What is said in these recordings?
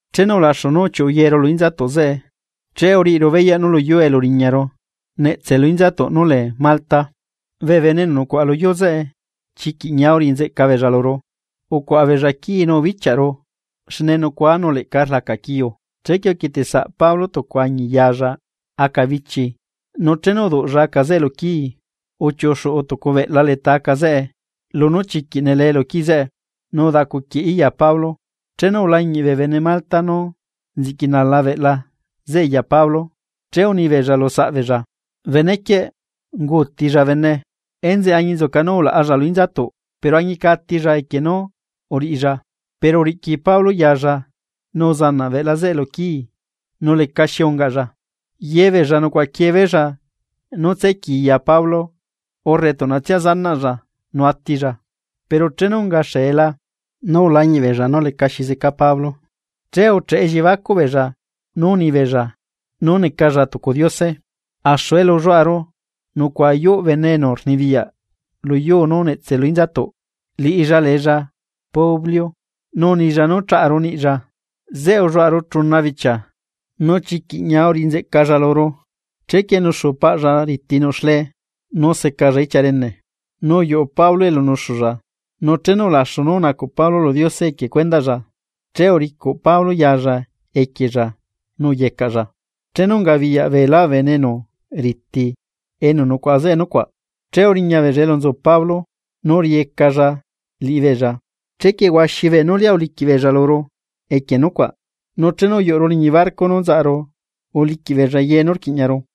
Chenu ulaxu nú uchiuꞌu yeru lu inzatuꞌ zeꞌe, che uriꞌiru beyaꞌ nú luyuu elu uriñaru netse lu inzatuꞌ núlee Malta. Bee bene enu nucuaꞌa luyuu zeꞌe chiquiꞌ ñia uriꞌinzeꞌca beella luru, ucuaꞌa beella quii nú ubichiaꞌru xne nucuaa nu leꞌca rlaca quiuu. Chequie uquieteꞌ saꞌ Pablo tucu añi yaalla aca bichi, nu chenu uduꞌlla aca zeꞌe luquii, uchiuꞌu xuꞌu tucu beꞌla leta aca zeꞌe lunú chiquiꞌ nelee lu quii zeꞌe nu udacuquieꞌí ya Pablo. Chenu ulañiꞌ bee bene Malta nú nziꞌqui nala beꞌla zeꞌe ya Pablo, che unibeella lu saꞌbeella: ―Benequieꞌ, unguutilla bene, enzeꞌe añinzuca nú ulaꞌalla lu inzatuꞌ, pero añica atilla equie nú uriꞌilla. Pero uriꞌqui Pablo yaalla nu uzanaꞌ beꞌla zeꞌe luquii nu lecaxi ungaꞌlla. Yebeella nucuaꞌaquiee beella nú tsequii ya Pablo urre tuꞌnatsia zanaꞌlla nu atilla. Pero chenu unga xeela nú ulañiꞌbeella nú lecaxi zeca Pablo, che ucheꞌe elliebacuꞌ beella nú unibeella nú necalla tucu diose. Axu elu ulluaꞌaru nucuaꞌa yuꞌ bene enu rnibiyaꞌ luyuu nú netse lu inzatuꞌ, liꞌilla leella Publio. Nu unilla nú chaꞌaru niꞌlla, zeꞌe ulluaꞌaru chuna bichia nu chiquiꞌ ñia uriꞌinzeꞌcalla luru. Chequie nuxu paꞌlla riti nuꞌ xlee nu secalla ichia rene. Nu uyuꞌu Pablo elu nuxulla, nu chenu ulaxu nú unacuꞌ Pablo lu Diose equie cuendaꞌlla, che uricuꞌ Pablo ya Pablo equiella nu uyecaꞌlla. Chenu ungabiyaꞌ beelá bee bene enu riti enu nucuaꞌa zeꞌe nucuaꞌ, che uriñabeella elu nzu Pablo nu uriꞌiyecalla liꞌibeella. Chequie huaxi beenú lia uliquiꞌ beella luru equie nucuaꞌ. Nu chenu uyuꞌuru liñi barco nú nzaꞌaru uliquiꞌ beella ye nú quiꞌñaru.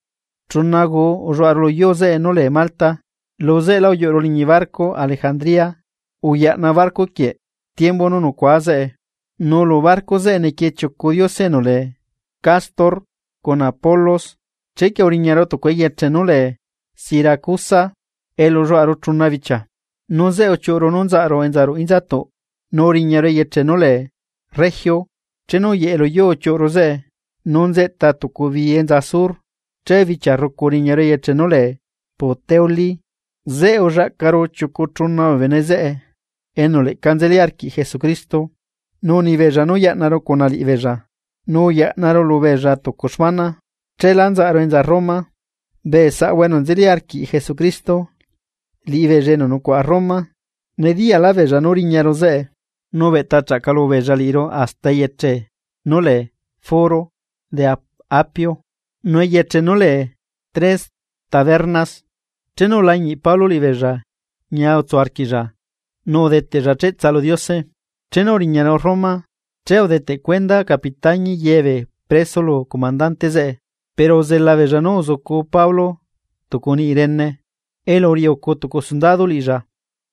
Chuna guu ulluaꞌaru luyuu zeꞌe nú lee Malta, lu zeꞌelá uyuꞌuru liñi barco Alejandría uyaꞌna barco quieꞌ tiembu nú nucua zeꞌe. Nu lu barco zeꞌe nequiee chiucu diose enu lee Cástor cuna Pólux. Chequie uriñaru tucu eyeche nú lee Siracusa elu ulluaꞌaru chuna bichia, Nu zeꞌe uchiuꞌru nú nzaꞌaru enza ruꞌu inzatuꞌ nu uriñaru eyeche nú lee Regio. Chenu uyeꞌe luyuu uchiuꞌru zeꞌe nu nzeꞌta tucu bii enza sur, che bichia rrucu uriñaru eyeche nú lee Puteolí. Zeꞌe ullaꞌcaru chiucu chuna bee bene zeꞌe enu leꞌca nzeli arquiꞌ Jesucristo, nu unibeella nú yaꞌnaru cuna liꞌibeella nu uyaꞌnaru lubeella tucu xmana, cheelá nzaꞌaru enza Roma. Bee saꞌahua enu nzeli arquiꞌ Jesucristo, liꞌibeella enu nucuaꞌa Roma nediyaꞌlaꞌbeella nú riñaru zeꞌe. Chequie uchiuꞌu beella nu ubeꞌta chaꞌcalu beella liꞌiru hasta eyeche nú lee Foro de Apio nu eyeche nú lee Tres Tabernas. Chenu ulañiꞌ Pablo liꞌibeella ñia utsu arquiꞌlla nu udeteꞌlla cheꞌtsa lu Diose. Chenu uriñaru Roma, che udeteꞌ cuenda capitañi ye bee preso lu comandante zeꞌe, pero uzela beella nú uzucu Pablo tucu niꞌi rene, elu uriꞌi ucu tucu sundado liꞌilla.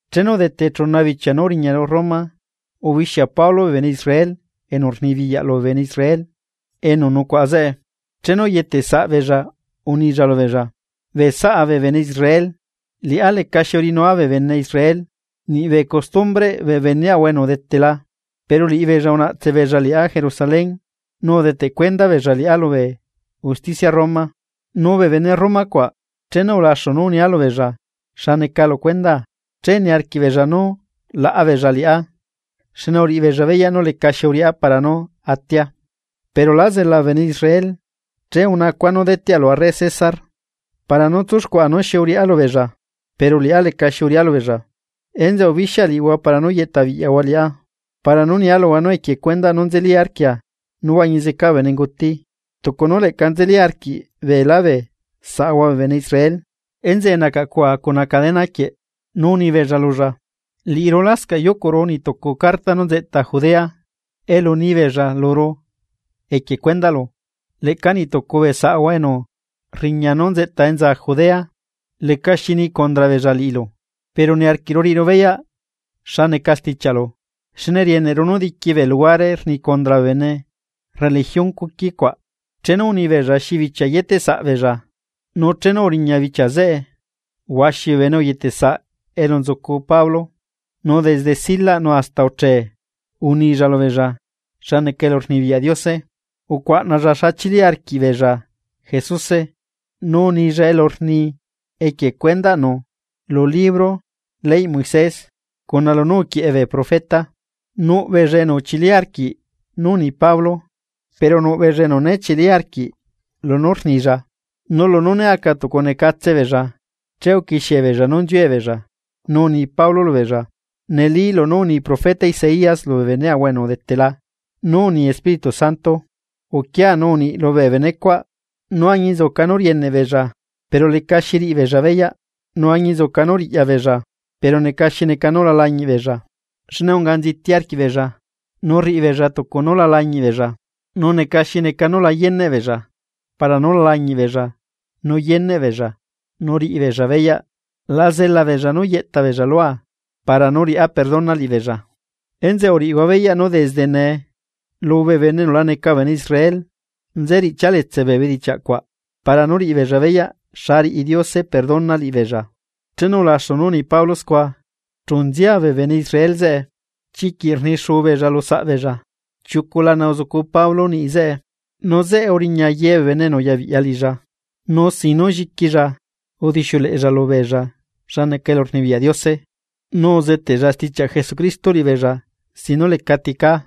Chenu udete chuna bichia nú uriñaru Roma, ubixia Pablo bee bene Israel enu rnibiyaꞌ lubee bene Israel enu nucuaꞌa zeꞌe. Chenu uyetesaꞌbeella unilla lubeella: ―Bee saꞌa bee bene Israel, liꞌá lecaxi uriꞌinua bee bene Israel niꞌbee costumbreꞌ bee beneaꞌahua enu udetela, pero liꞌibeella unaꞌtse beella liꞌá Jerusalén nu udeteꞌ cuenda beella liꞌá lubee usticia Roma. Nu bee bene Roma cuaꞌ, chenu ulaxu nú unia lubeella xa neca lu cuendaa che niarquiꞌbeella nú laꞌa beella liꞌá, xne uriꞌibeella beyaꞌ nú lecaxi uriꞌá para nú atia. Pero lá zela bee bene Israel, che unacua nú deteꞌa lu arre Césarpara nú tsuxcuaꞌa nú xi uriꞌá lubeella, pero liꞌá lecaxi uriꞌá lubeella. Enzeꞌe ubixia liꞌihua para nú yeꞌta biꞌyahua liꞌá para nú nia luhua nú equie nú nzeli arquia nú huañi zeca bee benenguti, tucu nú leꞌca nzeli arquiꞌ beelá bee saꞌahua bee bene Israel, enzeꞌe nacaꞌcua cuna cadena quieꞌ. Nu unibeella lulla: ―Liꞌiru lascaꞌ yucuꞌru niꞌ tucu carta nú nzeꞌta Judea elu nibeella luru equie cuendaꞌlu, leꞌca nitucu bee saꞌahua enu rriña nu nzeꞌta enza Judea lecaxi nii condra beella liꞌilu. Pero niarquiꞌru riꞌiru beyaꞌ xa neca stichiaꞌlu, xne rieneꞌru nú diqui bee luhuare rni condra bee bene religión cuqui cuaꞌ. Chenu unibeella xi bichia yeteꞌ saꞌbeella, nu chenu uriña bichia zeꞌe huaxi bee bene uyetesaꞌ elu nzucu Pablo. Nu desde silaꞌ nu hasta uchee unilla lubeella xa neca elurnibiyaꞌ Diose. Ucuaꞌnalla xa chili arquiꞌbeella Jesuse nu unilla elu rni equie cuendaꞌnu lu libro leyꞌ Moisés cuna lunú uquieꞌe bee profeta. Nuꞌ beella enu uchili arquiꞌ nú uni Pablo, pero nuꞌ beella enu né chili arquiꞌ lunú rnilla. Nu lunú né aca tucu necatse beella, che uquixiebeella nú nziue beella, nu uni Pablo lubeella: ―Neli lunú uni profeta Isaías lubee beneꞌahua enu udetela nú uni Espíritu Santo: Uquia nu uniꞌi lubee benecuaꞌ: Nú añinzuca nú rieneꞌ beella, pero lecaxi riꞌi beella beyaꞌ, nu añinzuca nú riꞌya beella, pero neca xi neca nú la lañiꞌbeella. Xne unga nziti arquiꞌbeella, nu rriꞌibeella tucu nú la lañiꞌbeella, nu neca xi neca nú la yeneꞌ beella para nú la lañiꞌbeella nu yeneꞌbeella nu riꞌibeella beyaꞌ. La zela beella nú yeꞌta beella lua para nú riꞌá perdona liꞌibeella. Enzeꞌe uriꞌihua beyaꞌ nú desde nee, lubee bene enu la neca bee bene Israel nze riꞌchia letse bee bedichiaꞌ cuaꞌ para nú riꞌibeella beyaꞌ xa riꞌi Diose perdona liꞌibeella. Chenu ulaxu nú uni Pablo scua, chu nzia bee bene Israel zeꞌe, Chiquiꞌ rnixuu beella lu saꞌbeella. Chiucu lana uzucu Pablo niꞌi zeꞌe. Nu zeꞌe uriña ye bee bene enu uyabiꞌya liꞌilla. Nu sin nú lliquilla udixiuleꞌella lubeella xa neca elurnibiyaꞌ Diose, nu uzeteꞌlla stichiaꞌ Jesucristo liꞌibeella sin nú lecati cá.